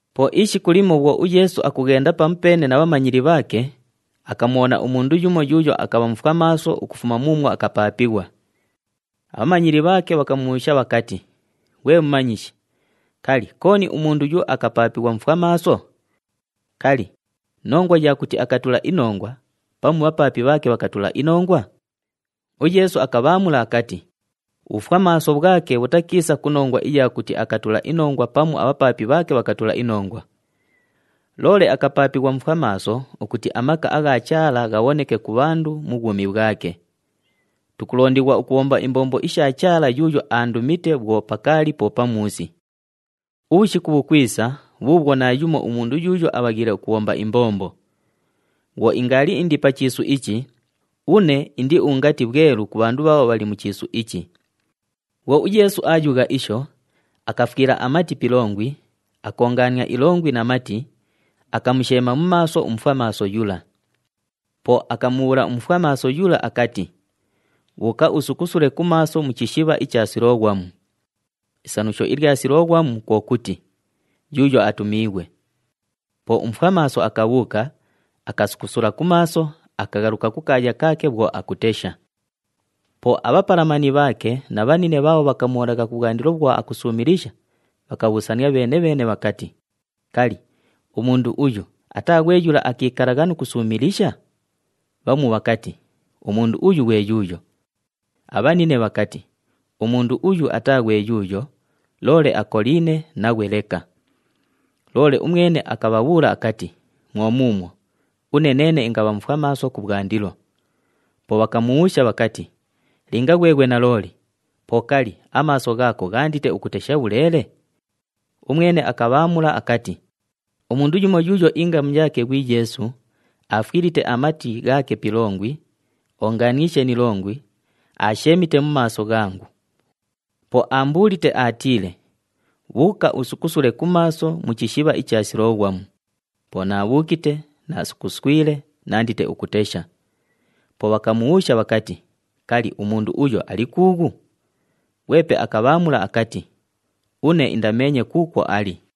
Po ishiku limo bhwo uYeesu akughenda pamupeene na bhamanyili bhaake, akamubhona umundu yumo yuuyo akabha mufwamaaso ukufuma muumwo akapaapighwa. Abhamanyili bhaake bhakamubhuusha bhakati, “Ghwe Mumanyishi, kali, kooni umundu uyu akapaapighwa mufwamaaso? Kali, nongwa ya kuti akatula inongwa pamu bhapaapi bhaake bhakatula inongwa?” UYeesu akabhaamula akati, “Ubhufwamaaso bhwake bhutakiisa ku nongwa iya kuti akatula inongwa pamu abhapaapi bhaake bhakatula inongwa. Loole akapaapighwa mufwamaaso ukuti amaka agha Chaala ghabhoneke ku bhandu mu bhwumi bhwake. Tukulondighwa ukubhomba imbombo isha Chaala yuuyo aandumite bhwo pakaali po pamuusi. Ubhushiku bhukwisa bhuubhwo naayumo umundu yuuyo abhaghiile ukubhomba imbombo. Bhwo ingaali indi pa chiisu ichi, une indi ungati bhwelu ku bhandu bhaabho bhali mu chiisu ichi.” Bhwo uYeesu aayugha isho, akafwila amati pi ilongwi, akoongaania ilongwi na mati, akamusheema mu maaso umufwamaaso yula. Po akamubhuula umufwamaaso yula akati, “Bhuuka usukusule ku maaso mu chishibha icha Siloghwamu.” Isanusho ilya Siloghwamu kwo kuti, “Yuuyo atumiighwe.” Po umufwamaaso akabhuuka, akasukusula ku maaso, akaghaluka kukaaya kaake bhwo akutesha. Po abhapalamani bhaake na bhanine bhaabho bhakamubhonagha kubhwandilo bhwo akusuumilisha, bhakabhuusania bheene-bheene bhakati, “Kali, umundu uyu ataa ghwe yula akiikalagha nu kusuumilisha?” Bhamu bhakati, “Umundu uyu ghwe yuuyo.” Abhanine bhakati, “Umundu uyu ataa ghwe yuuyo, loole akoliine naghwe leka.” Loole umwene akabhabhuula akati, “Mwo muumwo, une neene ingabha mufwamaaso kubhwandilo.” Po bhakamubhuusha bhakati, “Linga ghweghwe nalooli, po kali, amaaso ghaako ghaandite ukutesha bhuleele?” Umwene akabhaamula akati, “Umundu yumo yuuyo ingamu yaake ghwi Yeesu, aafwilite amati ghaake pi ilongwi, oongaaniishe ni ilongwi, aasheemite mu maaso ghangu. Po aambuulite aatiile, ‘Bhuuka usukusule ku maaso mu chishibha icha Siloghwamu.’ Po naabhuukite, naasukuswile, naandite ukutesha.” Po bhakamubhuusha bhakati, “Kali, umundu uyo ali kuughu?” Ghwepe akabhaamula akati, “Une indameenye kuukwo ali.”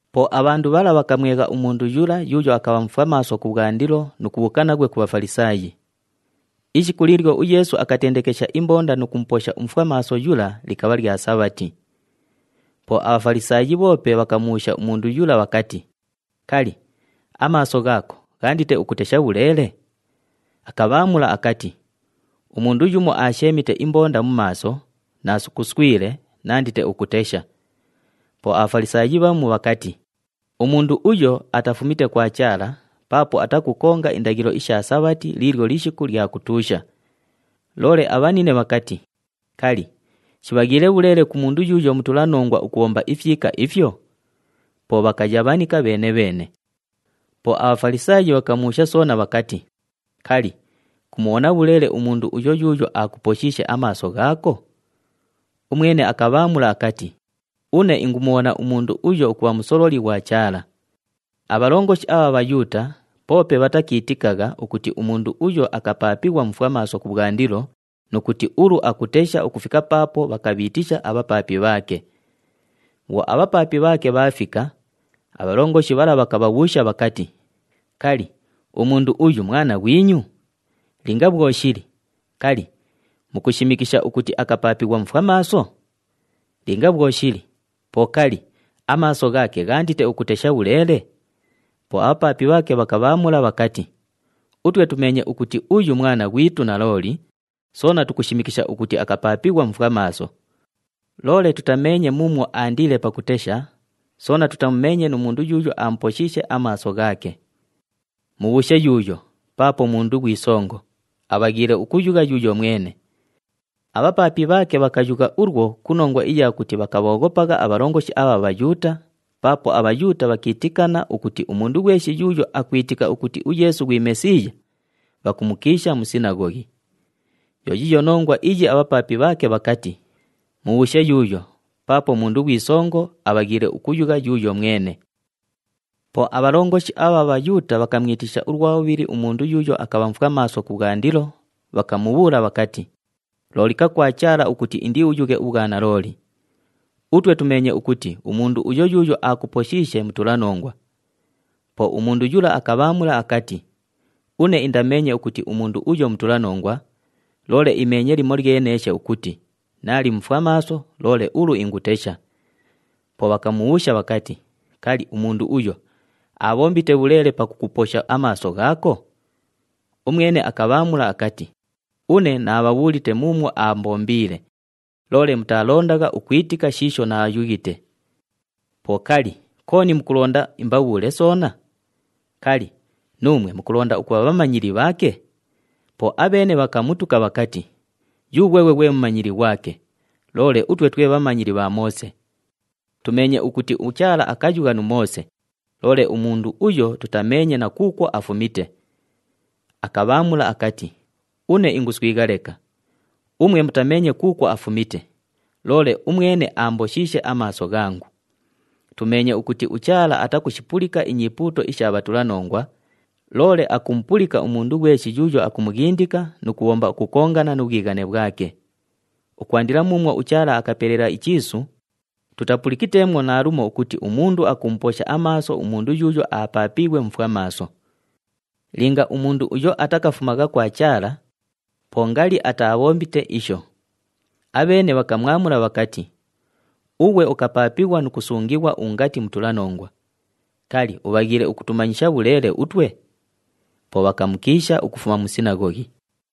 Po abhandu bhala bhakamwegha umundu yula yuuyo akabha mufwamaaso kubhwandilo nu kubhuuka naghwe ku Bhafalisaayi. Ishiku liilyo uYeesu akatendekesha imbonda nu kumuposha umufwamaaso yula likabha lya Sabhati. Po aBhafalisaayi bhoope bhakamubhuusha umundu yula bhakati, “Kali, amaaso ghaako ghaandite ukutesha bhuleele?” Akabhaamula akati, “Umundu yumo aasheemite imbonda mu maaso, naasukuswile, naandite ukutesha.” Po aBhafalisaayi bhamu bhakati, “Umundu uyo atafumite kwa Chaala paapo atakukonga indaghilo isha Sabhati liilyo lishiku lya kutuusha.” Loole abhanine bhakati, “Kali, shibhaghiile bhuleele ku mundu yuuyo mutulanongwa ukubhomba ifyika ifyo?” Po bhakayabhanika bheene-bheene. Po aBhafalisaayi bhakamubhuusha soona bhakati, “Kali, kumubhona bhuleele umundu uyo yuuyo aakuposhiishe amaaso ghaako?” Umwene akabhaamula akati, “Une ingumubhona umundu uyo ukubha musololi ghwa Chaala.” Abhalongoshi abha Bhayuuta poope bhatakiitikagha ukuti umundu uyo akapaapighwa mufwamaaso kubhwandilo nu kuti ulu akutesha ukufika paapo bhakabhiitisha abhapaapi bhaake. Bhwo abhapaapi bhaake bhaafika, abhalongoshi bhala bhakabhabhuusha bhakati, “Kali, umundu uyu mwana ghwinyu? Linga bhwo shili, kali, mukushimikisha ukuti akapaapighwa mufwamaaso? Linga bhwo shili, po kali, amaaso ghaake ghaandite ukutesha bhuleele?” Po abhapaapi bhaake bhakabhaamula bhakati, “Utwe tumeenye ukuti uyu mwana ghwitu nalooli, soona tukushimikisha ukuti akapaapighwa mufwamaaso. Loole tutameenye muumwo aandiile pakutesha, soona tutamumeenye nu mundu yuuyo aamuposhiishe amaaso ghaake. Mubhuushe yuuyo, paapo mundu ghwi songo, abhaghiile ukuyugha yuuyo mwene.” Abhapaapi bhaake bhakayugha ulwo ku nongwa iya kuti bhakabhooghopagha abhalongoshi abha Bhayuuta, paapo aBhayuuta bhakiitikana ukuti umundu ghweshi yuuyo akwitika ukuti uYeesu ghwi Mesiiya, bhakumukiisha mu sinaghoghi. Yo yiiyo nongwa iyi abhapaapi bhaake bhakati, “Mubhuushe yuuyo, paapo mundu ghwi songo, abhaghiile ukuyugha yuuyo mwene.” Po abhalongoshi abha Bhayuuta bhakamwitisha ulwa bhubhili umundu yuuyo akabha mufwamaaso kubhwandilo, bhakamubhuula bhakati, “Loolika kwa Chaala ukuti indiuyughe ubhwanalooli! Utwe tumeenye ukuti umundu uyo yuuyo aakuposhiishe mutulanongwa.” Po umundu yula akabhaamula akati, “Une indameenye ukuti umundu uyo mutulanongwa, loole imeenye limolyeneeshe ukuti naali mufwamaaso, loole ulu ingutesha.” Po bhakamubhuusha bhakati, “Kali, umundu uyo aabhombite bhuleele pakukuposha amaaso ghaako?” Umwene akabhaamula akati, “Une naabhabhuulite muumwo aambombiile, loole mutaalondagha ukwitika shiisho naayughite. Po kali, kooni mukulonda imbabhuule soona? Kali, nuumwe mukulonda ukubha bhamanyili bhaake?” Po abheene bhakamutuka bhakati, “Yughweghwe ghwe mumanyili ghwake, loole utwe twe bhamanyili bha Moose. Tumeenye ukuti uChaala akayugha nu Moose, loole umundu uyo tutameenye na kuukwo afumite.” Akabhaamula akati, “Une inguswigha leka! Umwe mutameenye kuukwo afumite, loole umwene aamboshiishe amaaso ghangu! Tumeenye ukuti uChaala atakushipulika inyipuuto isha bhatulanongwa, loole akumupulika umundu ghweshi yuuyo akumughindika nu kubhomba ukukongana nu bhwighane bhwake. Ukwandila muumwo uChaala akapelela ichiisu, tutapulikiteemwo naalumo ukuti umundu akumuposha amaaso umundu yuuyo apaapiighwe mufwamaaso. Linga umundu uyo atakafumagha kwa Chaala, po ngali atabhombite isho.” Abheene bhakamwamula bhakati, “Ughwe ukapaapighwa nu kusungighwa ungati mutulanongwa. Kali, ubhaghiile ukutumanyisha bhuleele utwe?” Po bhakamukiisha ukufuma mu sinaghoghi.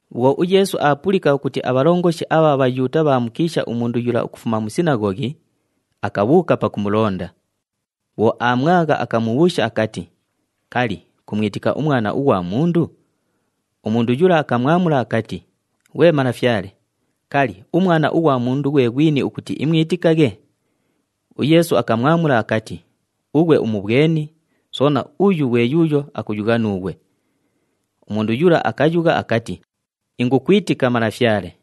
Bhwo uYeesu aapulika ukuti abhalongoshi abha Bhayuuta bhaamukiisha umundu yula ukufuma mu sinaghoghi, akabhuuka pakumulonda. Bhwo aamwagha, akamubhuusha akati, “Kali, kumwitika uMwana ughwa Mundu?” Umundu yula akamwamula akati, “Ghwe Malafyale, kali, uMwana ughwa Mundu ghwe ghwini ukuti imwitikaghe?” UYeesu akamwamula akati, “Ughwe umubhweni, soona uyu ghwe yuuyo akuyugha nuughwe.” Umundu yula akayugha akati, “Ingukwitika, Malafyale.”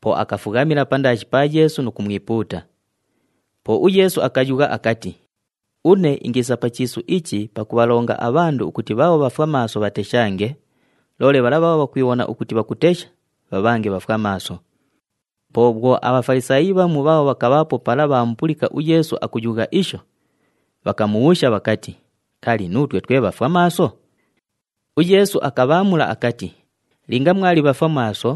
Po akafughamila pandaashi pa Yeesu nu kumwipuuta. Po uYeesu akayugha akati, “Une ingiisa pa chiisu ichi pakubhalonga abhandu ukuti bhaabho bhafwamaaso bhateshange, loole bhala bhaabho bhakwibhona ukuti bhakutesha, bhabhange bhafwamaaso.” Po bhwo aBhafalisaayi bhamu bhaabho bhakabhaapo pala bhaamupulika uYeesu akuyugha isho, bhakamubhuusha bhakati, “Kali, nuutwe twe bhafwamaaso?” UYeesu akabhaamula akati, “Linga mwali bhafwamaaso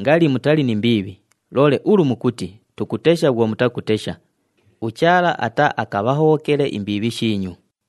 ngali mutali ni mbiibhi, loole ulu mukuti, ‘Tukutesha,’ bhwo mutakutesha, uChaala ataaakabhahobhokele imbiibhi shiinyu.”